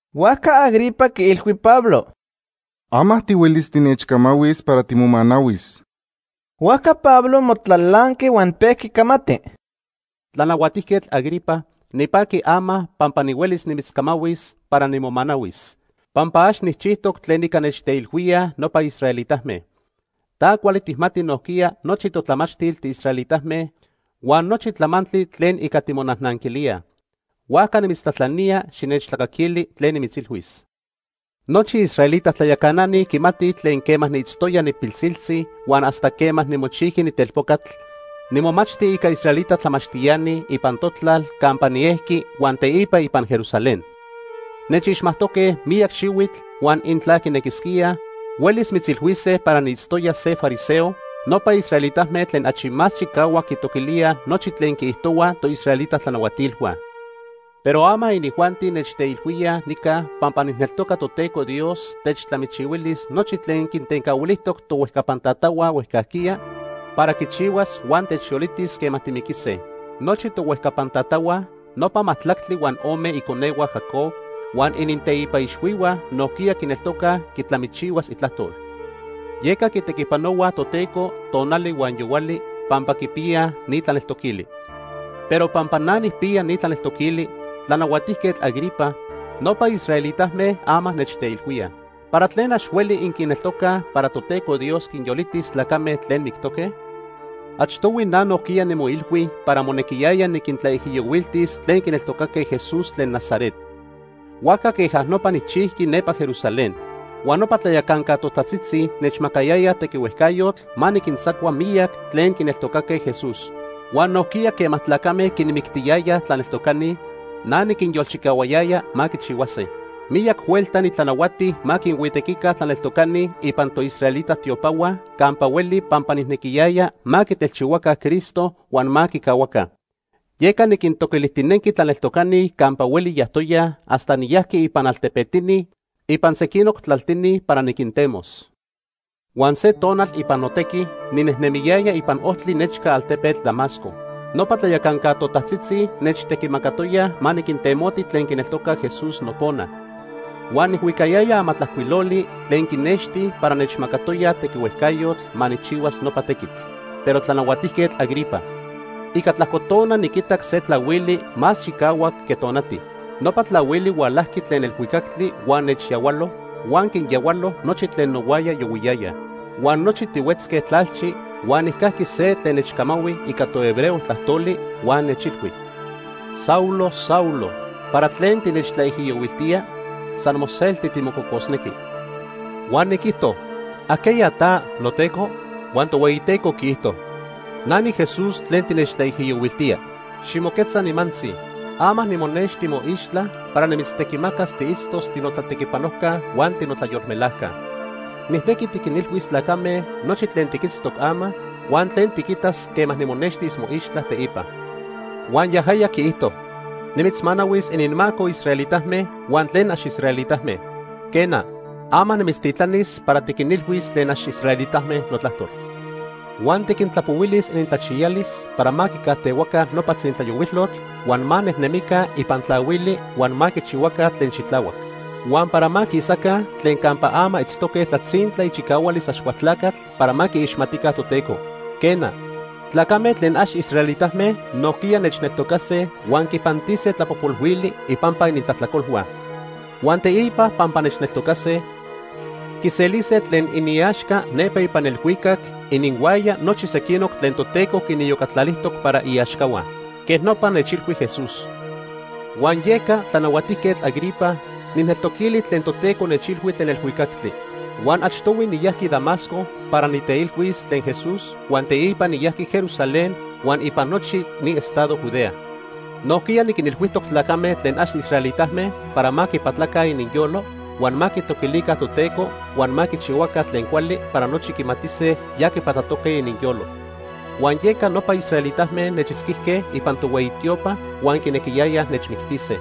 Huajca Agripa quiilhui Pablo: ―Ama tihuelis tinechcamahuis para timomanahuis. Huajca Pablo momatlalanqui huan pejqui camati: “Tlanahuatijquetl Agripa, nipaqui ama pampa nihuelis nimitzcamahuis para nimomanahuis, pampa ax nijchijtoc tlen ica nechteilhuíaj nopa israelitame. Ta cuali tijmati nojquiya nochi totlamachtil tiisraelitame huan nochi tlamantli tlen ica timonajnanquilíaj. Huajca nimitztlajtlanía xinechtlacaquili tlen nimitzilhuis. “Nochi israelita tlayacanani quimatij tlen quema niitztoya nipilsiltzi huan hasta quema nimochijqui nitelpocatl, nimomachti ica israelita tlamachtiani ipan notlal campa niejqui huan teipa ipan Jerusalén. Nechixmajtoque miyac xihuitl huan intla quinequisquíaj, huelis mitzilhuise para niitztoya se fariseo, nopa israelitame tlen achi más chicahuac quitoquilíaj nochi tlen quiijtohuaj toisraelita tlanahuatilhua. Pero ama inijuanti nechteilhuíaj nica pampa nijneltoca Toteco Dios techtlamichihuilis nochi tlen quintencahuilijtoc tohuejcapan tatahua huejcajquiya para quichihuas huan techyolitis quema timiquise. Nochi tohuejcapan tatahua, nopa majtlactli huan ome iconehua Jacob, huan ininteipa ixhuihua nojquiya quineltocaj quitlamichihuas itlajtol, yeca quitequipanohuaj Toteco tonali huan yohuali pampa quipiyaj ni tlaneltoquili. Pero pampa na nijpiya ni tlaneltoquili, Tlanahuajtiquetl Agripa, nopa israelitame ama nechteilhuíaj. ¿Para tlen ax hueli inquineltocaj para Toteco Dios quinyolitis tlacame tlen mictoque? “Achtohui na nojquiya nimoilhui para monequiyaya niquintlaijiyohuiltis tlen quineltocaque Jesús tlen Nazaret. Huajca queja nopa nijchijqui nepa Jerusalén. Huan nopa tlayacanca totajtzitzi nechmacayayaj tequihuejcayotl ma niquintzacua miyac tlen quineltocaque Jesús. Huan nojquiya quema tlacame quinmictiyayaj tlaneltocani, na niquinyolchicahuayaya ma quichihuase. Miyac huelta nitlanahuati ma quinhuitequica tlaneltocani ipan toisraelita tiopahua campa hueli pampa nijnequiyaya ma quitelchihuaca Cristo huan ma quicahuaca. Yeca niquintoquilijtinenqui tlaneltocani campa hueli yajtoyaj hasta niyajqui ipan altepetini ipan sequinoc tlaltini para niquintemos. “Huan se tonal ipan notequi ninejnemiyaya ipan ojtli nechca altepetl Damasco. Nopa tlayacanca totajtzitzi nechtequimacatoyaj ma niquintemoti tlen quineltocaj Jesús nopona. Huan nijhuicayaya amatlajcuiloli tlen quinexti para nechmacatoyaj tequihuejcayotl ma nijchihuas nopa tequitl. Pero Tlanahuatijquetl Agripa, ica tlajco tona niquitac se tlahuili más chicahuac que tonati. Nopa tlahuili hualajqui tlen elhuicactli huan nechyahualo huan quinyahualo nochi tlen nohuaya yohuiyayaj. Huan nochi tihuetzque tlalchi huan nijcajqui se tlen nechcamahui ica tohebreo tlajtoli huan nechilhui: ‘Saulo, Saulo, ¿para tlen tinechtlaijiyohuiltía? San moselti timococosnequi.’ “Huan niquijto: ‘¿Ajqueya ta, noTeco?’ “Huan Tohueyiteco quiijto: ‘Na niJesús tlen tinechtlaijiyohuiltía. Ximoquetza nimantzi. Ama nimonexti moixtla para nimitztequimacas tiitztos tinotlatequipanojca huan tinotlayolmelajca. Nijnequi tiquinilhuis tlacame nochi tlen tiquitztoc ama huan tlen tiquitas quema nimonextis moixtla teipa.’ “Huan yajaya quiijtoj: ‘Nimitzmanahuis ininmaco israelitame huan tlen ax israelitame. Quena, ama nimitztitlanis para tiquinilhuis tlen ax israelitame notlajtol. Huan tiquintlapohuilis inintlachiyalis para ma quicajtehuaca nopa tzintlayohuilotl huan ma nejnemica ipan tlahuili huan ma quichihuaca tlen xitlahuac. Huan para ma quisaca tlen campa ama itztoque tlatzintla ichicahualis Axcualtlacatl para ma quiixmatica Toteco. Quena, tlacame tlen ax israelitame nojquiya nechneltocase huan quipantise tlapojpolhuili ipampa inintlajtlacolhua. Huan teipa pampa nechneltocase, quiselise tlen iniaxca nepa ipan elhuicac ininhuaya nochi sequinoc tlen Toteco quiniyocatlalijtoc para iaxcahua.’ Quej nopa nechilhui Jesús. “Huan yeca, Tlanahuatijquetl Agripa, nijneltoquili tlen Toteco nechilhui tlen elhuicactli. Huan achtohui niyajqui Damasco para niteilhuis tlen Jesús huan teipa niyajqui Jerusalén huan ipan nochi ni estado Judea. Nojquiya niquinilhuijtoc tlacame tlen ax israelitame para ma quipatlaca ininyolo, huan ma quitoquilica Toteco huan ma quichihuaca tlen cuali para nochi quimatise ya quipatlatoque ininyolo. Huan yeca nopa israelitame nechitzquijque ipan tohueyi tiopa huan quinequiyayaj nechmictise.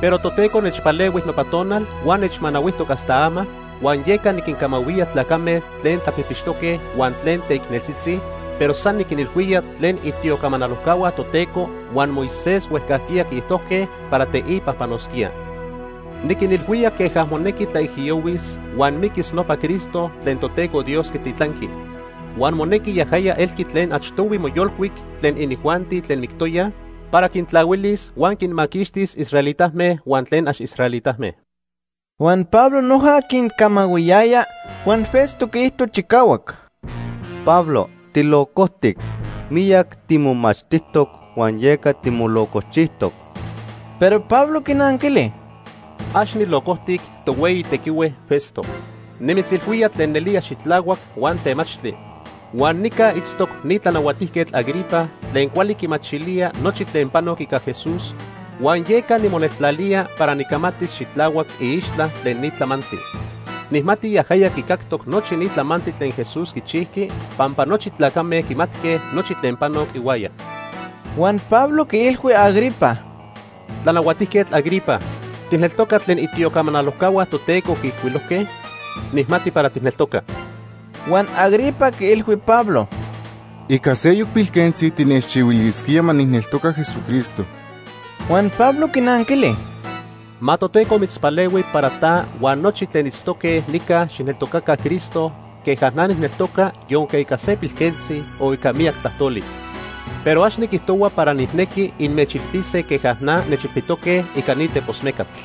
Pero Toteco nechpalehui nopa tonal huan nechmanahuijtoc hasta ama, huan yeca niquincamahuía tlacame tlen tlapijpixtoque huan tlen teicneltzitzi, pero san niquinilhuía tlen itiocamanalojcahua Toteco huan Moisés huejcajquiya quiijtojque para teipa panosquía. Niquinilhuía queja monejqui tlaijiyohuis huan miquis nopa Cristo tlen Toteco Dios quititlanqui. Huan monejqui yajaya elqui tlen achtohui moyolcuic tlen inijuanti tlen mictoyaj para quintlahuilis huan quinmaquixtis israelitame huan tlen ax israelitame.” Huan Pablo noja quincamahuiyaya, huan Festo quiijto chicahuac: ―¡Pablo tilocojtic! Miyac timomachtijtoc huan yeca timolocochijtoc. Pero Pablo quinanquili: ―Ax nilocojtic, titohueyi tequihue Festo. Nimitzilhuía tlen nelía xitlahuac huan temachtli. Huan nica itztoc ni Tlanahuatijquetl Agripa tlen cuali quimachilía nochi tlen panoc ica Jesús huan yeca nimoneltlalía para nicamatis xitlahuac iixtla tlen ni tlamantli. Nijmati yajaya quicactoc nochi ni tlamantli tlen Jesús quichijqui pampa nochi tlacame quimatque nochi tlen panoc ihuaya. Huan Pablo quiilhui Agripa: ―Tlanahuatijquetl Agripa, ¿tijneltoca tlen itiocamanalojcahua Toteco quiijcuilojque? Nijmati para tijneltoca. Huan Agripa quiilhui Pablo: ―Ica seyoc pilquentzi tinechchihuilisquía ma nijneltoca Jesucristo. Huan Pablo quinanquili: ―Ma Toteco mitzpalehui para ta huan nochi tlen itztoque nica xijneltocaca Cristo queja na nijneltoca yonque ica se pilquentzi o ica miyac tlajtoli. Pero ax niquijtohua para nijnequi inmechilpise queja na nechilpitoque ica ni tepos mecatl.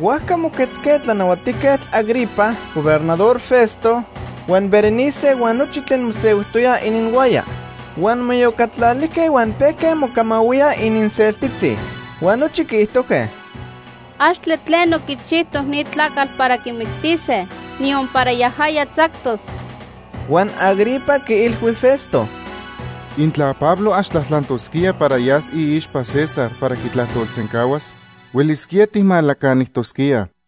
Huajca moquetzque Tlanahuatijquetl Agripa, Gobernador Festo, huan Berenice huan nochi tlen mosehuijtoyaj ininhuaya. Huan moiyocatlalijque huan pejque mocamahuíaj ininseltitzi. Huan nochi quiijtojque: ―Axtle tleno quichijtoc ni tlacatl para quimictise, niyon para yajaya tzactos. Huan Agripa quiilhui Festo: ―Intla Pablo ax tlajtlantosquía para yas iixpa César para quitlajtolsencahuas, huelisquía tijmalacanijtosquíaj.